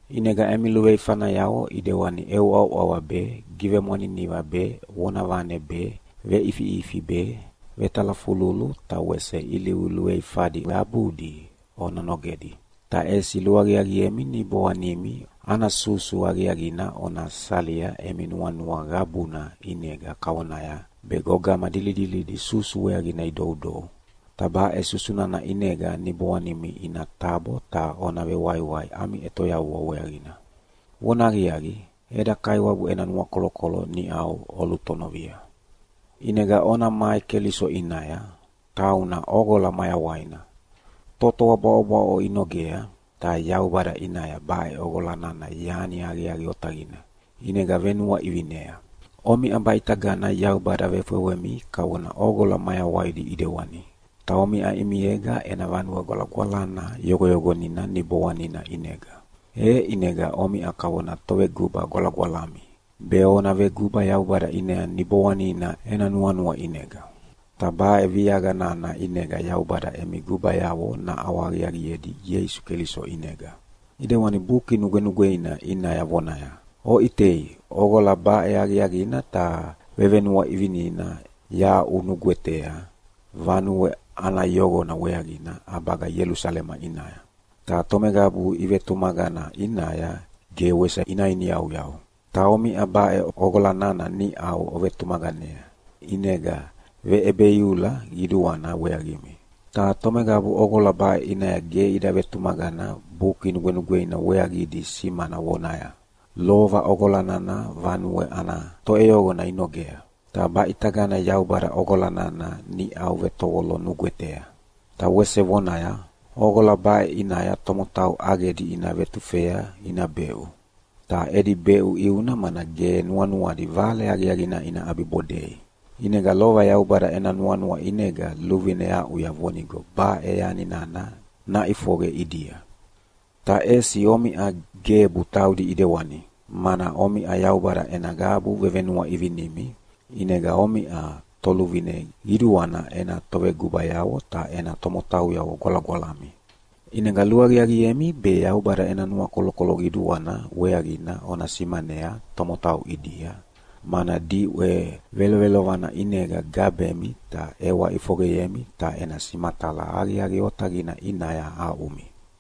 ʼInega emi luveifanayavo ʼidewani ʼeuʼauʼava be, givemwaniniva be, vonavane be, veʼifiʼifi be, vetalafululu ta wese ilivu luveifadi qabudi ona nogedi. Ta ʼesi luaqiaqiemi niboanimi ana susu aqiaqina ona salia emi nuanua qabuna ʼinega kavonaya be gogama dilidilidi susu weaqina idoudou, ta baʼe susu nana ʼinega niboanimi ina tabo ta ona vewaiwai ami ʼetoyavua weaqina. Vonahaqiaqi, eda Kaiwabu ena nuakolokolo niʼau olutonovia. ʼInega ona mai Keliso ʼinaya, tauna ʼoqola mayawaina. Totoa bwaʼobwaʼo inogea, ta Yaubada ʼinaya baʼe ʼoqola nana yani aqiaqi otaqina, ʼinega venuaʼivinea. Omiʼa baʼitagana Yaubada vefewemi kavona ʼoqola mayawaidi ʼidewani, ta omiʼa ʼimiega ena vanue gwalagwalana yoqoyoqonia Niboanina ʼinega. E ʼinega omiʼa kavona toveguba gwalagwalami, be ona veguba Yaubada ʼinaya Niboanina ena nuanua ʼinega. Ta baʼe viaqa nana ʼinega Yaubada emi gubayavo naʼawahaqiaqiedi Ieisu Keliso ʼinega. ʼIdewani Buki Nugwenugweina ʼinaya vonaya, “Oʼitea ʼoqola baʼe aqiaqina ta vevenuaʼivinina yahaʼunugwetea vanue ana yoqona weaqina ʼabaga Ielusalema ʼinaya, ta tomeqabu ivetumaqana ʼinaya ge wese ina iniyauyau.” Ta omiʼa baʼe ʼoqola nana niʼau ovetumaqanea, ʼinega veʼebeiula qiduana weaqimi. Ta tomeqabu ʼoqola baʼe ʼinaya ge ida vetumaqana Buki Nugwenugweina weaqidi simana vonaya, “Lova ʼoqola nana vanue ana toʼeyoqona inogea, ta baʼitagana Yaubada ʼoqola nana niʼau vetovolo nugwetea.” Ta wese vonaya, “ʼOqola baʼe ʼinaya tomotau ʼaqedi ina vetufea ina beʼu.” Ta edi beʼu ʼiuna mana ge nuanuadi Vale Aqiaqina ina ʼabibodei. ʼInega lova Yaubada ena nuanua ʼinega luvine aʼuya vonigo baʼe yani nana naʼifoqe ʼidia. Ta ʼesi omiʼa gebu taudi ʼidewani, mana omiʼa Yaubada ena qabu vevenuaʼivinimi, ʼinega omiʼa Toluvine Qiduana ena tovegubayavo ta ena tomotauyavo gwalagwalami. ʼInega luaqiaqiemi be Yaubada ena nuakolokolo qiduana weaqina ona simanea tomotau ʼidia, mana diʼwe velovelovana ʼinega gabemi ta ʼewa ʼifoqeyemi ta ena simatala aqiaqi otaqina ʼinaya aʼumi.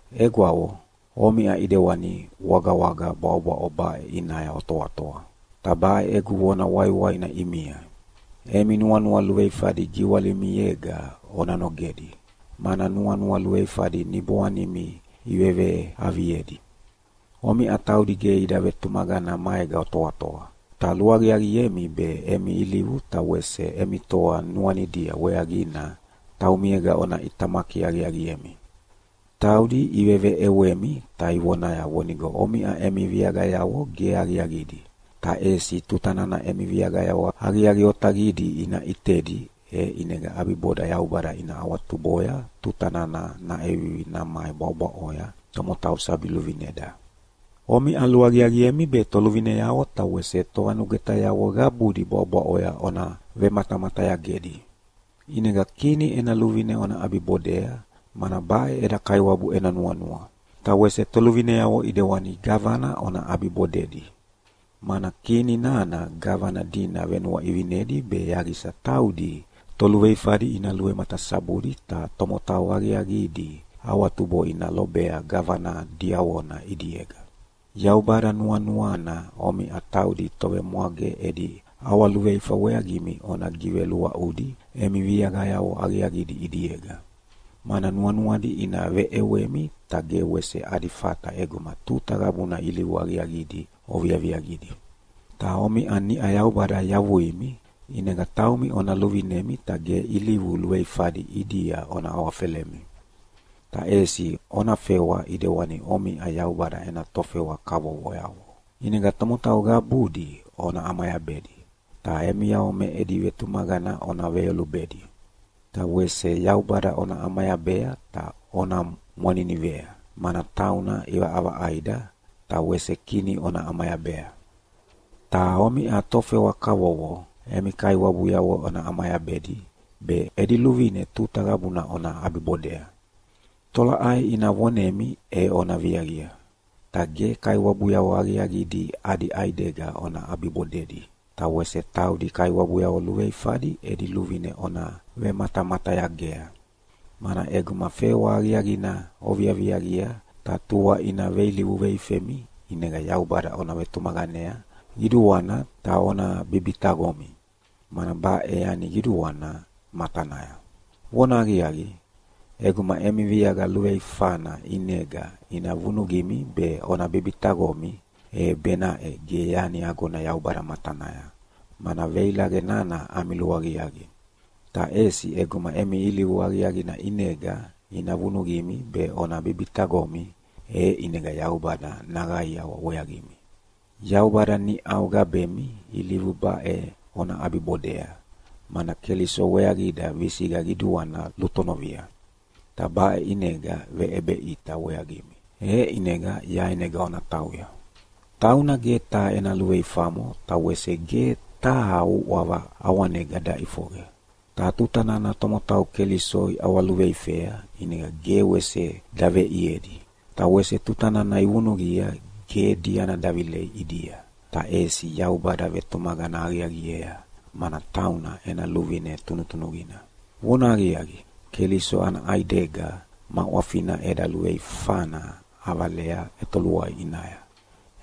Egwavo, omiʼa ʼidewani wagawaga bwaʼobwaʼo baʼe ʼinaya otoatoa. Ta baʼe egu vona waiwaina ʼimia: Emi nuanua luveifadi giwalimiega ona nogedi, mana nuanua luveifadi niboanimi iveveaviedi. Omiʼa taudi ge ida vetumaqana maega otoatoa, ta luaqiaqiemi be emi ilivu ta wese emi toa nuanidia weaqina taumiega ona ʼitamaki aqiaqiemi. Taudi iveveʼewemi ta ivonaya vonigo omiʼa emi viaqayavo ge aqiaqidi, ta ʼesi tuta nana emi viaqayavo aqiaqi otaqidi ina ʼitedi e ʼinega ʼabiboda Yaubada ina awatuboya tuta nana naʼevivi namai bwaʼobwaʼoya tomotau sabi luvineda. Omiʼa luaqiaqiemi be toluvineavo ta wese tovanugwetayavo qabudi bwaʼobwaʼoya ona velumatamatayagedi. ʼInega kini ena luvine ona ʼabibodea, mana baʼe eda Kaiwabu ena nuanua. Ta wese toluvineavo ʼidewana gavana ona ʼabibodedi, mana kini nana gavana dina venuaʼivinedi be yaqisa taudi toluveifadi ina luvematasabudi ta tomotau aqiaqidi awatubo ina lobea gavana diavona ʼidiega. Yaubada nuanuana omiʼa taudi tovemwage edi ʼawaluveifa weaqimi ona giveluaʼudi emi viaqayavo aqiaqidi ʼidiega. Mana nuanuadi ina veʼewemi, ta ge wese adi fata ʼeguma tuta qabuna ilivu aqiaqidi oviaviaqidi. Ta omiʼa niʼa Yaubada yavuimi, ʼinega taumi ona luvinemi ta ge ilivu luveifadi ʼidia ona awafelemi. Ta ʼesi ona fewa ʼidewani omiʼa Yaubada ena tofewa kavovoyavo. ʼInega tomotau qabudi ona ʼamayabedi, ta emiavo me edi vetumaqana ona veyolubedi. Ta wese Yaubada ona ʼamayabea ta ona mwaninivea, mana tauna ʼivaʼavaʼaida. Ta wese kini ona ʼamayabea. Ta omiʼa tofewa kavovo, emi kaiwabuyavo ona ʼamayabedi be edi luvine tuta qabuna ona ʼabibodea. Tolaʼai ina vonemi e ona viaqia. Ta ge kaiwabuyavo aqiaqidi adi ʼaidega ona ʼabibodedi, ta wese taudi kaiwabuyavo luveifadi edi luvine ona vematamatayagea. Mana ʼeguma fewa aqiaqina oviaviaqia ta tua ina veilivu veifemi ʼinega Yaubada ona vetumaqanea qiduana ta ona bibitaqomi, mana baʼe yani qiduana matanaya. Vonahaqiaqi, ʼeguma emi viaqa luveifana ʼinega ina vunuqimi be ona bibitaqomi, e benaʼe ge yani agona Yaubada matanaya, mana veilaqe nana ami luaqiaqi. Ta ʼesi ʼeguma emi ilivu aqiaqina ʼinega ina vunuqimi be ona bibitaqomi, e ʼinega Yaubada naqaiawa weaqimi. Yaubada niʼau gabemi ilivu baʼe ona ʼabibodea, mana Keliso weaqida visiqa qiduana lutonovia, ta baʼe ʼinega veʼebeʼita weaqimi, e ʼinega yaenega ona tauya. “Tauna ge taha ena luveifamo ta wese ge taha uʼava ʼawanega daʼifoqe.” Ta tuta nana tomotau Keliso iʼawaluveifea ʼinega ge wese daveʼiedi. Ta wese tuta nana ivunuqia ge diana davilei ʼidia, ta ʼesi Yaubada vetumaqana aqiaqiea, mana tauna ena luvine tunutunuqina. Vonahaqiaqi, Keliso ana ʼaidega ma ʼwafina eda luveifana ʼavalea ʼetoluai ʼinaya,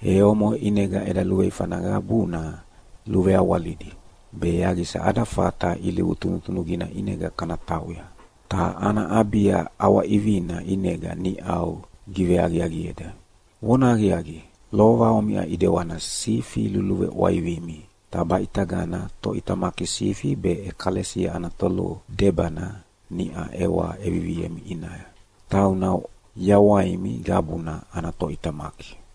e omoʼe ʼinega eda luveifana qabuna luveawalidi, be yaqisa ada fata ilivu tunutunuqina ʼinega kana tauya. Ta ana ʼabia ʼawaʼivina ʼinega niʼau giveaqiaqieda. Vonahaqiaqi, lova omiʼa ʼidewana sifi luluveʼwaivimi, ta baʼitagana Toʼitamaki Sifi be ʼEkalesia ana Toludebana niʼa ʼewa ʼeviviemi ʼinaya. Tauna yawaimi qabuna ana Toʼitamaki.